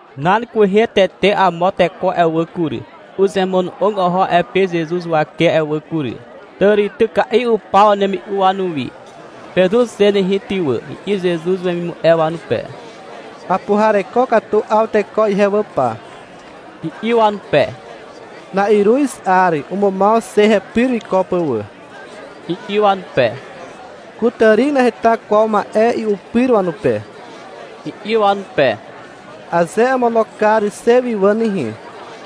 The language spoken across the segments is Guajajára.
Nan kwehe tete amo teko a'e wà kury, uzemono'og oho a'e pe Zezuz huwake a'e wà kury. Tàrityka'i upaw wanemi'u wanuwi. — Pezur xe nehe ty wà, i'i Zezuz wemimu'e wanupe. — Apuhareko katu 'aw teko ihe wà pa, i'i wanupe. — Na'iruz 'ar umumaw xe hepyr wiko pà wà, i'i wanupe. — Kutàri naheta kwaw ma'e i'u pyr wanupe, i'i wanupe. — Aze amono kar xe wi ihe wà nehe,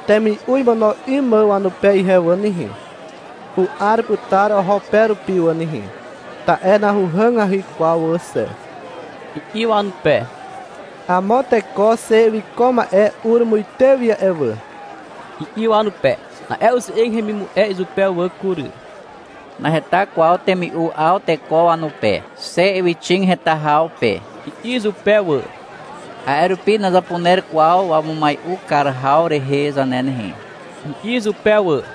temi'u imono 'ym mà wanupe ihe wà nehe, u'ar putar oho pe rupi wà nehe, ta'e nahuhàgahy kwaw wà xe, i'i wanupe. — Amo teko xe wiko ma'e ur muite wi a'e wà, i'i wanupe. Na'e uze'eg hemimu'e izupe wà kury. — Naheta kwaw temi'u 'aw teko wanupe, xe ywyxig heta haw pe, i'i izupe wà. — A'e rupi nazapuner kwaw wamumai'u kar haw rehe zane nehe, i'i izupe wà.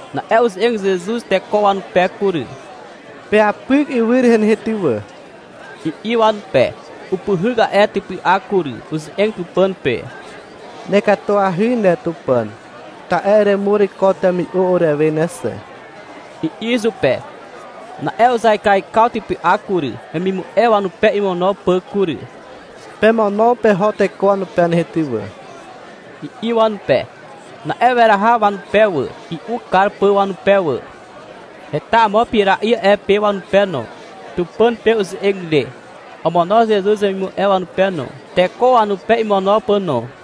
Na'e uze'eg Zezuz teko wanupe kury. — Peapyk ywy rehe nehe ty wà, i'i wanupe. Upyhyk a'e typy'ak kury, uze'eg Tupàn pe. — Nekatuahy ne Tupàn, ta'e eremur ko temi'u urewe ne xe, i'i izupe. Na'e uzaikaikaw typy'ak kury, wemimu'e wanupe imono pà kury. — Pemono peho teko wanupe nehe ty wà, i'i wanupe. Na'e weraha wanupe wà, i'u kar pà wanupe wà. Heta amo pira'i a'e pe wanupe no. Tupàn pe uze'eg ire, omono Zezuz wemimu'e wanupe no, teko wanupe imono pà no.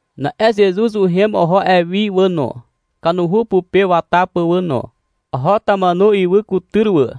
Na'e Zezuz uhem oho a'e wi wà no, kanuhu pupe wata pà wà no. Oho Tamanu ywy kutyr wà.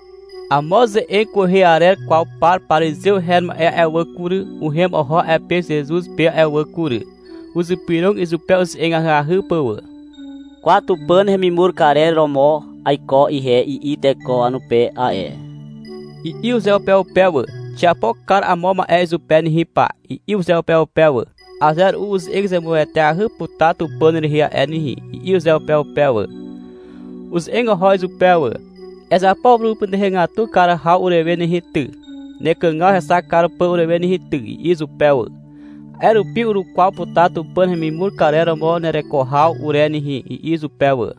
Amo ze'eg kwehe arer kwaw par parizew her ma'e a'e wà kury, uhem oho a'e pe Zezuz pe a'e wà kury. Uzypyrog izupe uze'eg ahyahy pà wà. — Kwa, Tupàn hemimur karer romo aiko ihe, i'i teko wanupe a'e, i'i uzeupeupe wà. — Xiapo kar amo ma'e izupe nehe pa, i'i uzeupeupe wà. — Aze ru'u uze'eg zemueteahy putar Tupàn rehe a'e nehe, i'i uzeupeupe wà. Uze'eg oho izupe wà. — Ezapo purumupytuhegatu kar haw urewe nehe ty, nekàgaw hexak kar pà urewe nehe ty, i'i izupe wà. — A'e rupi urukwaw putar Tupàn hemimur karer romo nereko haw ure nehe, i'i izupe wà.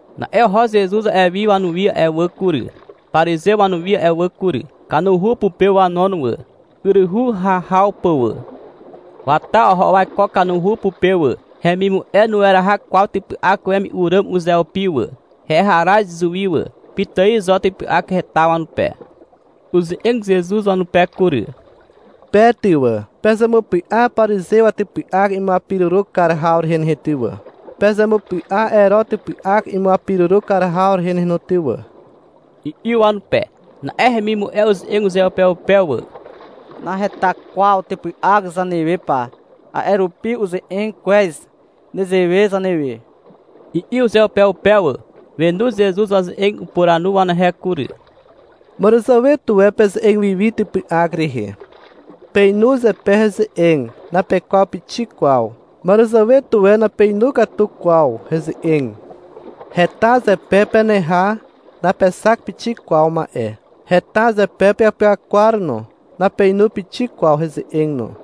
Na'e oho Zezuz a'e wi wanuwi a'e wà kury, parizew wanuwi a'e wà kury. Kanuhu pupe wanon wà, yryhu hahaw pà wà. Wata oho waiko kanuhu pupe wà. Hemimu'e nueraha kwaw typy'ak wemi'u ràm uzeupi wà. Heharaz izuwi wà. Pitài zo typy'ak heta wanupe. Uze'eg Zezuz wanupe kury. — Pe ty wà, pezemupy'a parizew watypy'ak imuapiruru kar haw rehe nehe ty wà, pezemupy'a Ero typy'ak imuapiruru kar haw rehe nehe no ty wà, i'i wanupe. Na'e hemimu'e uze'eg uzeupeupe wà. — Naheta kwaw typy'ak zanewe pa, a'e rupi uze'eg kwez nezewe zanewe, i'i uzeupeupe wà. Wenu Zezuz waze'eg. Upuranu wanehe kury. — Màràzàwe tuwe peze'eg wi wi typy'ak rehe. Peinu zepe heze'eg, napekwaw pixik kwaw. Màràzàwe tuwe napeinu katu kwaw heze'eg. Heta zepe peneha, napexak pixik kwaw ma'e. Heta zepe peapyakwar no, napeinu pixik kwaw heze'eg no.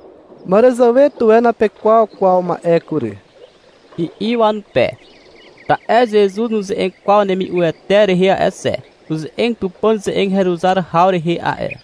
— Màràzàwe tuwe napekwaw kwaw ma'e kury, i'i wanupe. (Ta'e Zezuz nuze'eg kwaw wanemi'uete rehe a'e xe. Uze'eg Tupàn ze'eg heruzar haw rehe a'e.)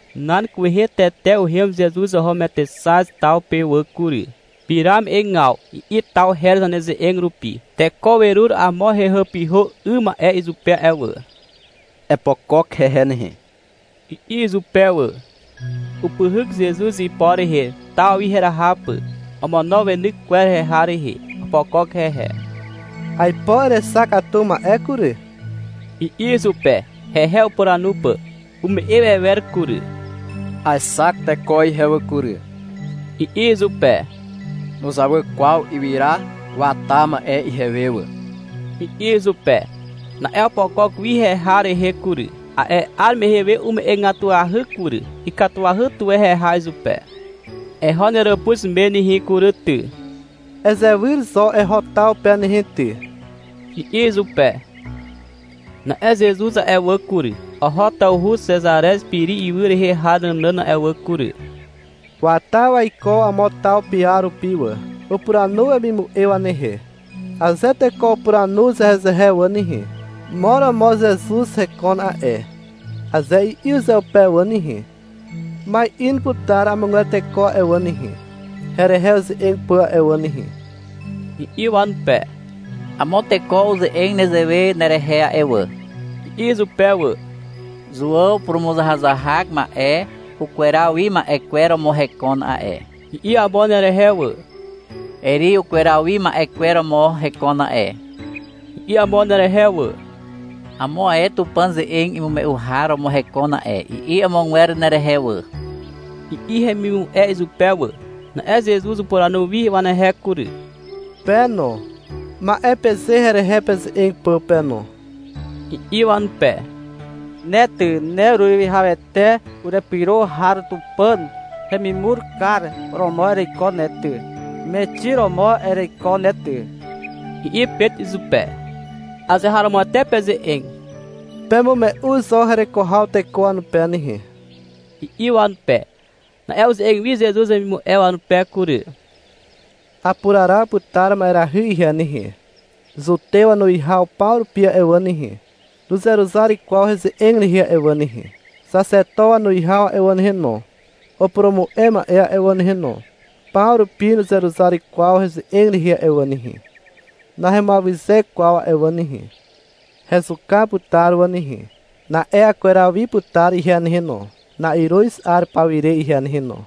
Nan kwehe tete uhem Zezuz oho Metexaz taw pe wà kury. (— Pira me'egaw, i'i taw her zaneze'eg rupi.) Teko werur amo hehàpyhà 'ym ma'e izupe a'e wà. — Epokok hehe nehe, i'i izupe wà. Upyhyk Zezuz ipo rehe, taw wi heraha pà. Omono weny kwer heha rehe. Opokok hehe. — Aipo erexak katu ma'e kury, i'i izupe, hehe upuranu pà. Ume'e wewer kury. — Aexak teko ihe wà kury, i'i izupe. — Nuzawy kwaw ywyra wata ma'e ihewe wà, i'i izupe. Na'e opokok wi heha rehe kury. A'e 'ar mehe we ume'egatuahy kury. Ikatuahy tuwe heha izupe. — Eho neràpuz me nehe kury ty, ezewyr zo eho taw pe nehe ty, i'i izupe. Na'e Zezuz a'e wà kury, oho tawhu Xezarez Piri ywy rehe har nànàn a'e wà kury. Wata waiko amo taw piar rupi wà. Upuranu wemimu'e wanehe. — Aze teko upuranu uzehezehe wà nehe, — Mo romo Zezuz hekon a'e, aze i'i uzeupe wà nehe, — Ma'in putar amogwer teko a'e wà nehe, herehe uze'eg pà a'e wà nehe, i'i wanupe. — Amo teko uze'eg nezewe nerehe a'e wà, i'i izupe wà. — Zuàw purumuzahazahak ma'e ukweraw wi ma'e kwer romo hekon a'e, i'i amo nerehe wà. — Eri ukweraw wi ma'e kwer romo hekon a'e, i'i amo nerehe wà. — Amo ae Tupàn ze'eg imume'u har romo hekon a'e, i'i amogwer nerehe wà, i'i hemimu'e izupe wà. Na'e Zezuz upuranu wi wanehe kury. — Pe no, ma'e peze herehe peze'eg pà pe no, i'i wanupe. — Ne ty, ne ureruwihawete urepyro har Tupàn hemimur kar romo ereiko ne ty. Mexi romo ereiko ne ty, i'i Pet izupe. — Azeharomoete peze'eg. Pemume'u zo hereko haw teko wanupe nehe, i'i wanupe. Na'e uze'eg wi Zezuz wemimu'e wanupe kury. — Apuraraw putar ma'erahy ihe nehe. Zutew wanuwihaw paw rupi a'e wà nehe, nuzeruzar kwaw heze'eg rehe a'e wà nehe. Xaxeto wanuwihaw a'e wà nehe no, upurumu'e ma'e a'e wà nehe no, paw rupi nuzeruzar kwaw heze'eg rehe a'e wà nehe, nahemuawyze kwaw a'e wà nehe. Hezuka putar wà nehe. Na'e akweraw wi putar ihe nehe no, na'iruz 'ar paw ire ihe nehe no.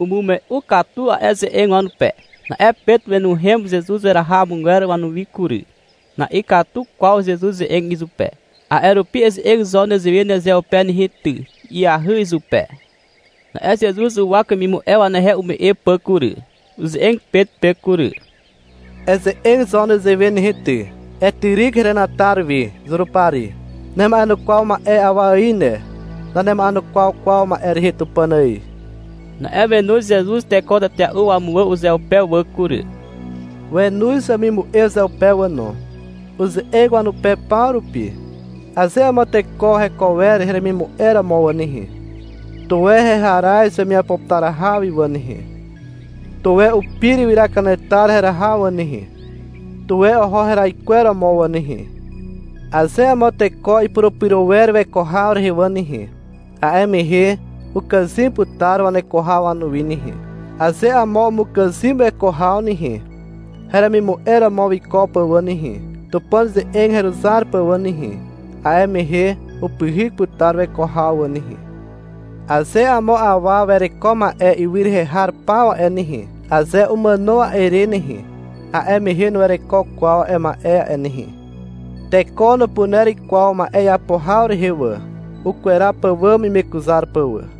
Umume'u katu a'e ze'eg wanupe. Na'e Pet wenuhem Zezuz heraha amogwer wanuwi kury. Na'ikatu kwaw Zezuz ze'eg izupe. A'e rupi — Eze'eg zo nezewe nezeupe nehe ty, i'i ahyahy izupe. Na'e Zezuz uwak wemimu'e wanehe ume'e pà kury. Uze'eg Pet pe kury. — Eze'eg zo nezewe nehe ty. Etyryk henatar wi, Zurupari. Nema'enukwaw ma'e rehe awa ài ne. Nanema'enukwaw kwaw ma'e rehe Tupàn ài. Na'e wenoz Zezuz teko tetea'u wamuwà uzeupe wà kury. Wenoz wemimu'e uzeupe wà no. Uze'eg wanupe paw rupi. — Aze amo teko heko wer heremimu'e romo wà nehe, tuwe heharaz wemiapo putar haw wi wà nehe. Tuwe upir ywyra kanetar heraha wà nehe. Tuwe oho heraikweromo wà nehe. Aze amo teko ipurupyro wer weko haw rehe wà nehe, a'e mehe ukàzym putar waneko haw wanuwi nehe. Aze amo umukàzym weko haw nehe, heremimu'e romo wiko pà wà nehe, Tupàn ze'eg heruzar pà wà nehe, a'e mehe upyhyk putar weko haw wà nehe. Aze amo awa wereko ma'e ywy rehe har paw a'e nehe, aze umàno a'e re nehe, a'e mehe nuwereko kwaw a'e ma'e a'e nehe. Teko nupuner kwaw ma'e iapo haw rehe wà, ukweraw pàwàm imekuzar pà wà.